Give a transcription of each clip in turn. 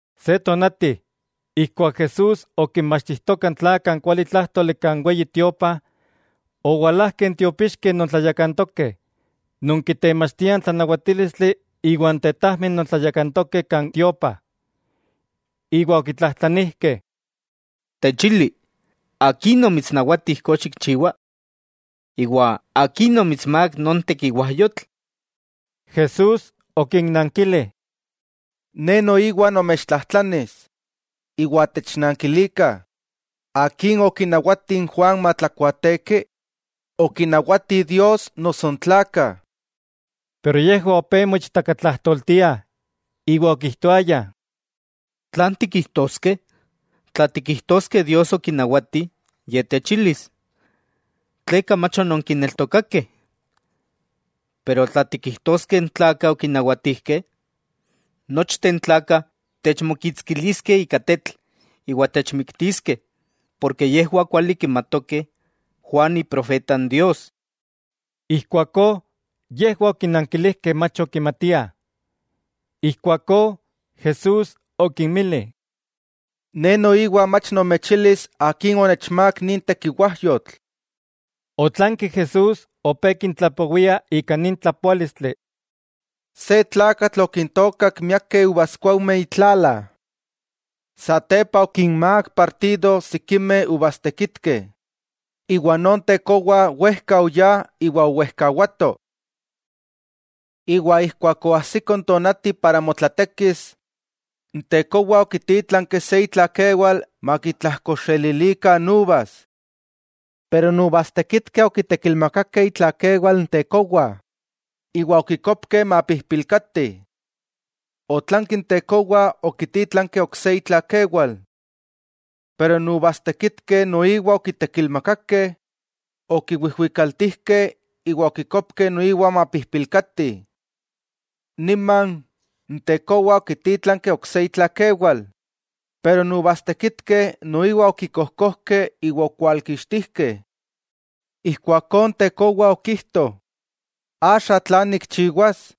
Se tonati, ijkuak Jesús okinmachtijtoka n tlakah n kualitlájtoli kan Weyi Tiopa, owalajkeh n tiopixkeh non tlayakantokeh, non kitemachtiah n tlanawatílistli iwa n tetajmeh non tlayakantokeh kan tiopa, iwa okitlajtlanijkeh: —Techili, ¿akin omitsnawati ijkó xikchiwa? Iwa, ¿akin omitsmák non tekiwajyotl? Jesús okinnankili: —Ne noiwa nomechtlajtlanis, iwa technankilikah: ¿Akin okinawati n Juan matlakuaateki? ¿Okinawati Dios noso n tlakah? Yejwah opé moichtakatlajtoltiah iwa okijtoayah: —¿Tlan tikijtoskeh? Tla tikijtoskeh Dios okinawati, Ye techilis: “¿Tleka mach ononkineltokakeh?” Pero, tla tikijtoskeh n tlakah okinawatijkeh, nochteh n tlakah techmokitskiliskeh ika tetl iwa techmiktiskeh, porke yejwah kuali kimatokeh Juan iprofeta n Dios. Ijkuakó, yejwah okinankilijkeh mach okimatiah. Ijkuakó Jesús okinmili: —Ne noiwa mach nomechilis akin onechmák nin tekiwajyotl. Otlanki Jesús opé kintlapowia ika nin tlapoálistli: —Se tlakatl okintookak miakeh uvaskuaujmeh itlala. Satepa okinmák partido sikimeh uvastekitkeh, iwa non tekowa wejka oyá, iwa owejkawato. Iwa ijkuak oajsiko n tonati para motlatekis, n tekowa okitítlanki se itlakewal makitlajkoxelilikah n uvas. Pero n uvastekitkeh okitekilmakakeh itlakewal n tekowa iwa okikopkeh mapijpilkati. Otlanki n tekowa okitítlanki ok se itlakewal. Pero n uvastekitkeh noiwa okitekilmakakeh, okiwijwikaltijkeh iwa okikopkeh noiwa mapijpilkati. Niman, n tekowa okitítlanki ok se itlakewal, pero n uvastekitkeh noiwa okikojkojkeh iwa okwalkixtijkeh. 'Ijkuakó n tekowa okijto: “¿Axa tlan nikchiwas?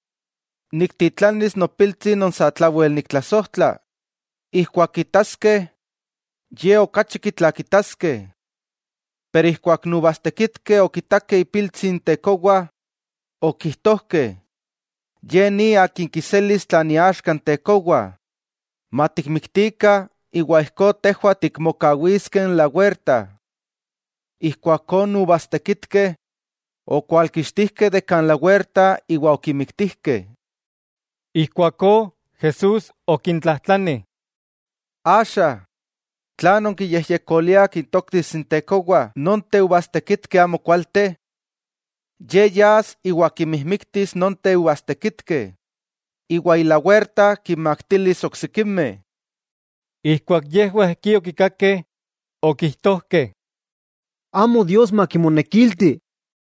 Niktitlanis nopiltsi non satlawel niktlasojtla, ijkuak kitaskeh, ye okachi kitlakitaskeh.” Pero ijkuak n uvastekitkeh okitakeh ipiltsi n tekowa, okijtojkeh: “Ye ni akin kiselis tlan iaxka n tekowa; matikmiktikah iwa ijkó tejwah tikmokawiskeh n lawerta.” Ijkuakó, n uvastekitkeh okwalkixtijkeh de kan lawerta iwa okimiktijkeh. Ijkuakó Jesús okintlajtlani: —Axa, ¿tlan nonkiyejyekoliah kintoktis n tekowa nonteh uvastekitkeh amokualteh? Ye yas iwa kinmijmiktis nonteh uvastekitkeh, iwa ilawerta kinmaktilis oksikimeh. Ijkuak yejwah ijkí okikakeh, okijtojkeh: —¡Amo Dios makimonekilti!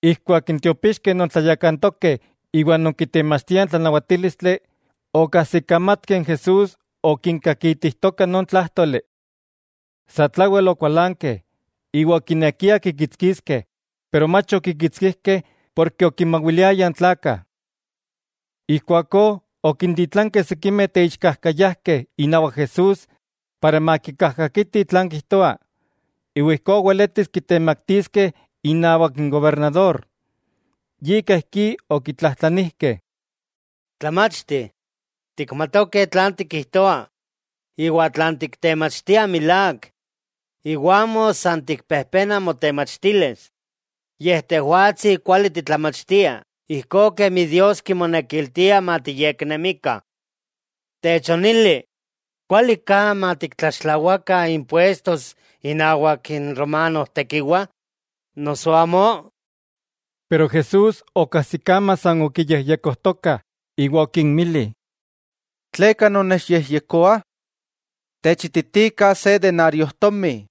Ijkuak n tiopixkeh non tlayakantokeh iwa non kitemachtiah n tlanawatílistli, okajsikamatkeh n Jesús okinkakitijtoka non tlájtoli. Satlawel okualankeh iwa okinekiah kikitskiskeh, pero mach okikitskijkeh porke okinmawiliayah n tlakah. Ijkuakó okintitlankeh sikimeh teixkajkayajkeh inawak Jesús para makikajkakitih tlan kijtoa, iwa ijkó weletis kitemaktiskeh inawak n gobernador. Yika ijkí okitlajtlanijkeh: —Tlamachti, tikmatokeh tlan tikijtoa iwa tlan tiktemachtia milák, iwa amo san tikpejpena motemachtilis. Tejwatsi kuali titlamachtia ijkó kemi Dios kimonekiltia matiyeknemikah. Techonili: ¿Kuali ka matiktlaxtlawakah impuestos inawak n romanojtekiwa, noso amó? Pero Jesús okajsikama san okiyejyekojtokah iwa okinmili: —¿Tleka nonnechyejyekoah? Techititikah se denariojtomi.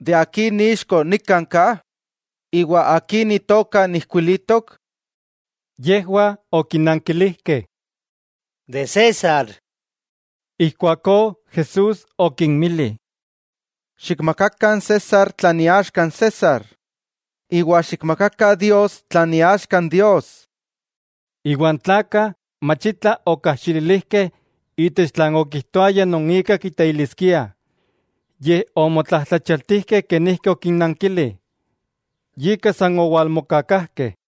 ¿De akin ixko nikan ka?, iwa ¿akin itoka ijkuilitok? Yejwah okinankilijkeh: —De César. Ijkuakó Jesús okinmili: —Xikmakakah n César tlan iaxka n César, iwa xikmakakah Dios tlan iaxka n Dios. Iwa n tlakah mach itla okajxililijkeh itech tlan okijtoaya non ika kiteiliskiah, yej omotlajtlachialtijkeh kenijki okinnankili, yika san owalmokakajkeh.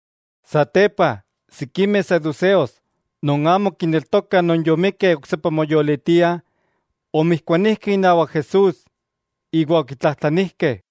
Satepa sikimeh saduseos non amo kineltokah non yomikkeh oksepa moyolitiah, omijkuanijkeh inawak Jesús iwa okitlajtlanijkeh: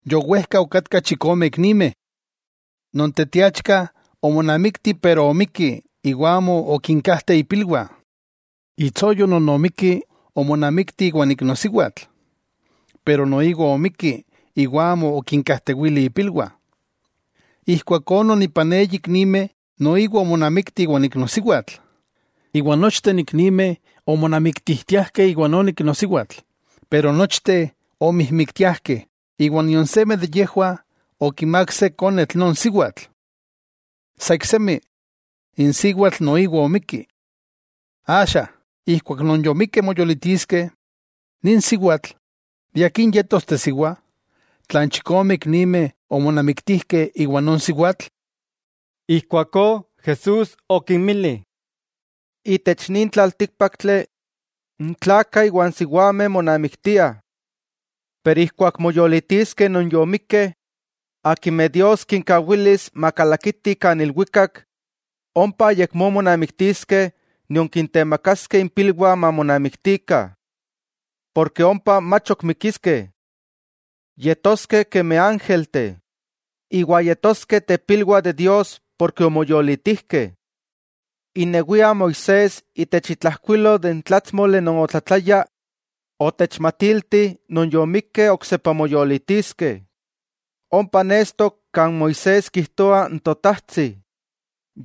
Yowejka okatkah chikome iknimeh. Non teteachka omonamikti pero omikki iwa amo okinkajteh ipilwah. Itsoyo non omikki omonamikti iwan iknosiwatl. Pero noiwa omikki iwa amo okinkajtewili ipilwah. Ijkuakó non ipan eyi iknimeh noiwa omonamikti iwa n iknosiwatl; iwa nochteh n iknimeh omonamiktijtiajkeh iwa non iknosiwatl pero nochteh omijmiktiajkeh, iwa nion seme de yejwah okimák se konetl non siwatl. Sa iksemi, n siwatl noiwa omikki. Axa, ijkuak non yomikkeh moyolitiskeh, nin siwatl ¿de akin yetos tesiwa, tla n chikome iknimeh omonamiktijkeh iwa non siwatl? Ijkuakó Jesús okinmili: —Itech nin tlaltíkpaktli, n tlakah iwa n siwameh monamiktiah. Pero ijkuak moyolitiskeh non yomikkeh, akimeh Dios kinkawilis makalakitih kan ilwikak; ompa ayakmó monamiktiskeh nion kintemakaskeh impilwah mamonamiktikah, porke ompa mach ok mikiskeh. Yetoskeh kemi ángelteh, iwa yetoskeh tepilwah de Dios porke omoyolitijkeh. Inewia n Moisés itech itlajkuilol de n tlátsmoli non otlatlaya, otechmatilti non yomikkeh oksepa moyolitiskeh. Ompa nestok kan Moisés kijtoa n Totajtsi,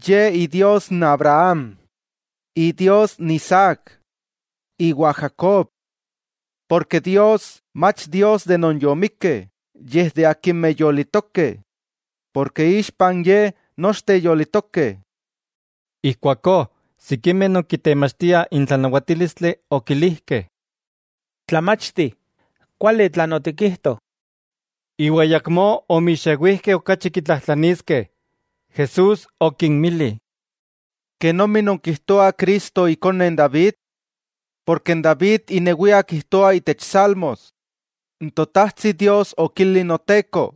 Ye Idios Abraham, Isaac, iwa Jacob. Porke Dios amo Dios de non yomikkeh, yej de akimeh yolitokeh, porke ixpa n Ye nochteh yolitokeh. Ijkuakó sikimeh non kitemachtiah n tlanawatílistli okilijkeh: —Tlamachti, kuali tlan otikijto. Iwa ayakmó omixewijkeh okachi kitlatlajtlaniskeh. Jesús okinmili: —¿Kenomi nonkijtoah Cristo ikone n David? Porke n David inewia kijtoa itech salmos: N Totajtsi Dios okili n Noteko: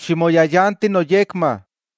“Ximoyayanti noyekma,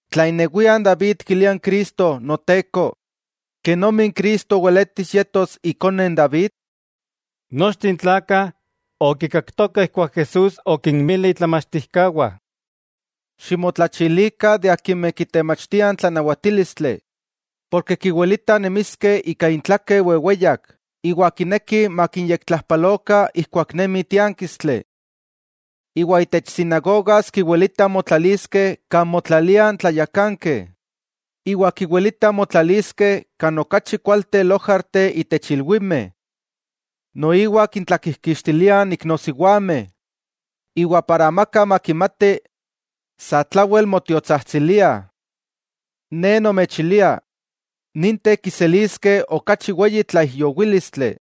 Tla inewia n David kilia n Cristo, Noteko; ¿kenomi n Cristo weletis yetos ikone n David? Nochteh n tlakah okikaktokah ijkuak Jesús okinmili itlamachtijkawah: —Ximotlachilikah de akimeh kitemachtiah n tlanawatílistli, porke kiwilitah nemiskeh ika intlakeh weweyak, iwa kinekih makinyektlajpalokah ijkuak nemi tiánkistli. Iwa itech sinagogas kiwilitah motlaliskeh kan motlaliah n tlayakankeh, iwa kiwilitah motlaliskeh kan okachi kualteh lojarteh itech ilwimeh. Noiwa kintlakijkixtiliah n iknosiwameh, iwa para amaka makimati, satlawel motiotsajtsiliah. Ne nomechilia, ninteh kiseliskeh okachi weyi tlaijyowílistli.